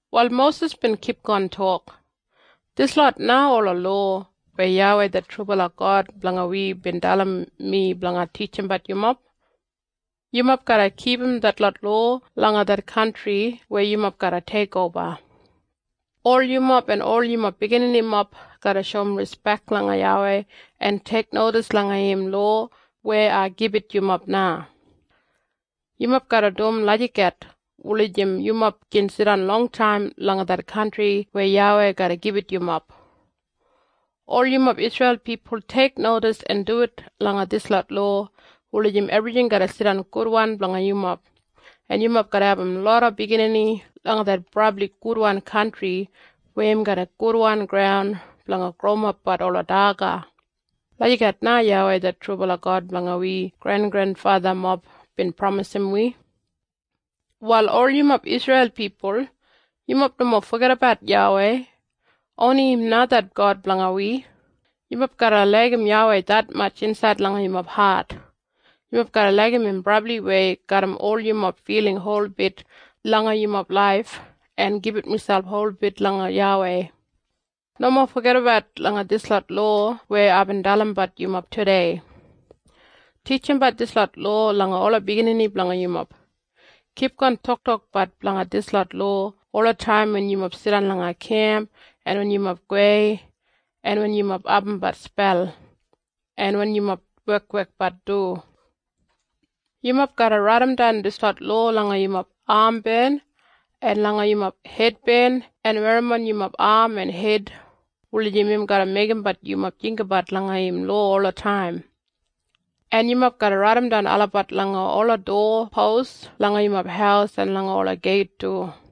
Wal Mosis bin kipgon tok, “Dislot na ola lowa weya YAWEI det trubala God blanga wi bin dalim mi blanga titjimbat yumob. Yumob garra kipum detlot lowa langa det kantri weya yumob garra teikoba. Ol yumob en ol yumob bigininimob garra shoum rispek langa YAWEI en teiknodis langa im lowa weya ai gibit yumob na. Yumob garra dum lagijat wulijim yumob gin jidan longtaim langa det kantri weya YAWEI garra gibit yumob. Ol yumob Isreil pipul teiknodis en duwit langa dislot lowa wulijim ebrijing garra jidan gudwan blanga yumob, en yumob garra abum loda biginini langa det brabli gudwan kantri weya im garram gudwan graun blanga growimapbat ola daga. Lagijat na YAWEI det trubala God blanga wi grengrenfathamob bin pramisim wi. “Wal ol yumob Isreil pipul, yumob nomo fogedabat YAWEI. Oni im na det God blanga wi. Yumob garra laigim YAWEI detmatj insaid langa yumob hat. Yumob garra laigim im brabliwei garram ol yumob filing holbit langa yumob laif en gibit miselp holbit langa YAWEI. Nomo fogedabat langa dislot lowa weya aibin dalimbat yumob tudei. Titjimbat dislot lowa langa ola biginini blanga yumob. Kipgon toktokbat blanga dislot lowa olataim wen yumob jidan langa kemp, o wen yumob go samweya, o wen yumob abumbat spel, o wen yumob wekwekbat du. Yumob garra raidimdan dislot lowa langa yumob amben en langa yumob hedben en werrimon langa yumob am en hed, wulijim im garra meigimbat yumob jinggabat langa im lowa olataim. En yumob garra raidimdan olabat langa ola dowa pos langa yumob haus en langa ola geit du.”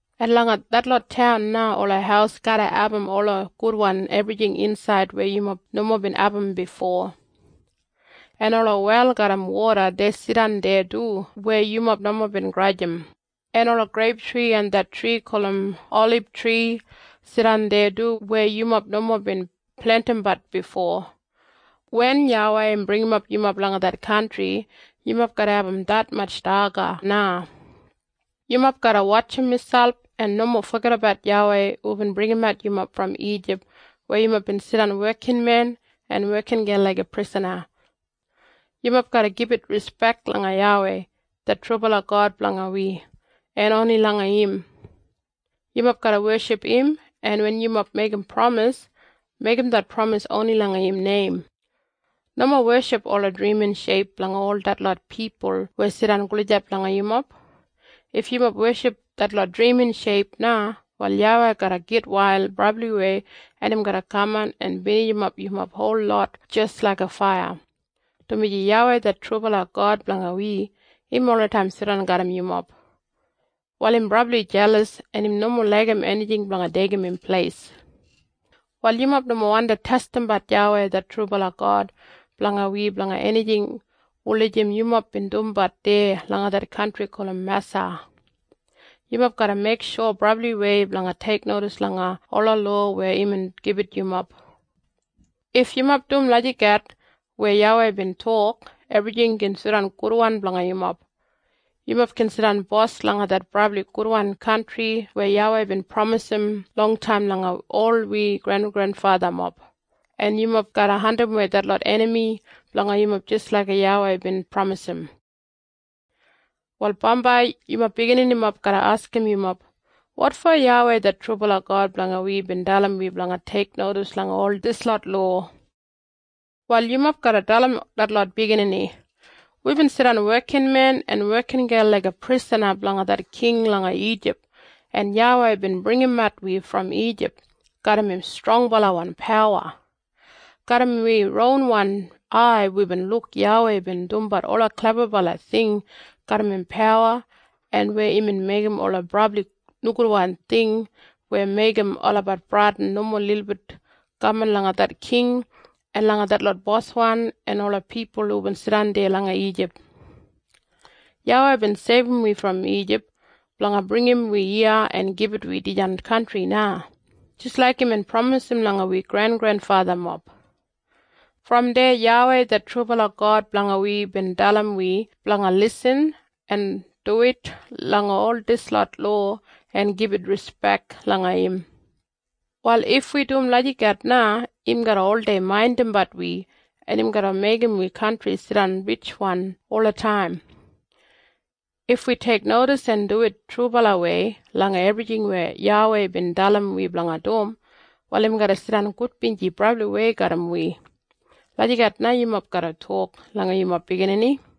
En langa detlot taun na ola haus garra abum ola gudwan ebrijing insaid weya yumob nomo bin abum bifo. En ola wel garram woda dei jidan deya du weya yumob nomo bin grajim, en ola greiptri en det tri gulum olibtri jidan deya du weya yumob nomo bin plentimbat bifo. Wen YAWEI im bringimap yumob langa det kantri yumob garra abum detmatj daga na. Yumob garra wotjim miselp en nomo fogedabat YAWEI hubin bringimat yumob brom Ijip weya yumob bin jidan wekinmen en wekingel laiga prisana. Yumob garra gibit rispek langa YAWEI det trubala God blanga wi, en oni langa im. Yumob garra weship im en wen yumob meigim pramis, meigim det pramis oni langa im neim. Nomo weship ola drimin sheip blanga ol detlot pipul weya jidan gulijap langa yumob. If yumob weship detlot drimin sheip na, wal YAWEI garra gitwail brabliwei en im garra kaman en binijimap yumob holot jis laiga faiya, dumaji YAWEI det trubala God blanga wi, im olataim jidan garram yumob. Wal im brabli jelas en im nomo laigim enijing blanga deigim im pleis. “Wal yumob nomo wandi testimbat YAWEI det trubala God blanga wi blanga enijing wulijim yumob bin dumbat deya langa det kantri gulum Masa. Yumob garra meiksho brabliwei blanga teiknodis langa ola lowa weya imbin gibit yumob. If yumob dum lagijat weya YAWEI bin tok ebrijing gin jidan gudwan blanga yumob. Yumob gin jidan bos langa det brabli gudwan kantri weya YAWEI bin pramisim longtaim langa ol wi grengrenfathamob, en yumob garra andimwei detlot enami blanga yumob jis laik YAWEI bin pramisim. “Wal bambai yumob bigininimob garra askim yumob, ‘Wotfo YAWEI det trubala God blanga wi bin dalim wi blanga teiknodis langa ol dislot lowa?’ Wal yumob garra dalim detlot biginini, ‘Wibin jidan wekinmen en wekingel laiga prisana blanga det king langa Ijip en YAWEI bin bringimat wi brom Ijip garram im strongbalawan pawa. Garram wi ronwan ai wibin luk YAWEI bin dumbat ola klebabala ting garram im pawa en weya imbin meigim ola brabli nogudwan ting weya meigim olabat bradin nomo lilbit kaman langa det king en langa detlot boswan en ola pipul hubin jidan deya langa Ijip. YAWEI bin seibum wi brom Ijip blanga bringim wi iya en gibit wi dijan kantri na, jis laik imbin pramisim langa wi grengrenfathamob. Brom deya YAWEI det trubala God blanga wi bin dalim wi blanga lisin en duwit langa ol dislot lowa en gibit rispek langa im. Wal if wi dum lagijat na im garra oldei maindimbat wi en im garra meigim wi kantri jidan ritjwan olataim. If wi teiknodis en duwit trubalawei langa ebrijing weya YAWEI bin dalim wi blanga dum, wal im garra jidan gudbinji brabliwei garram wi.’ Lagijat na yumob garra tok langa yumob biginini.”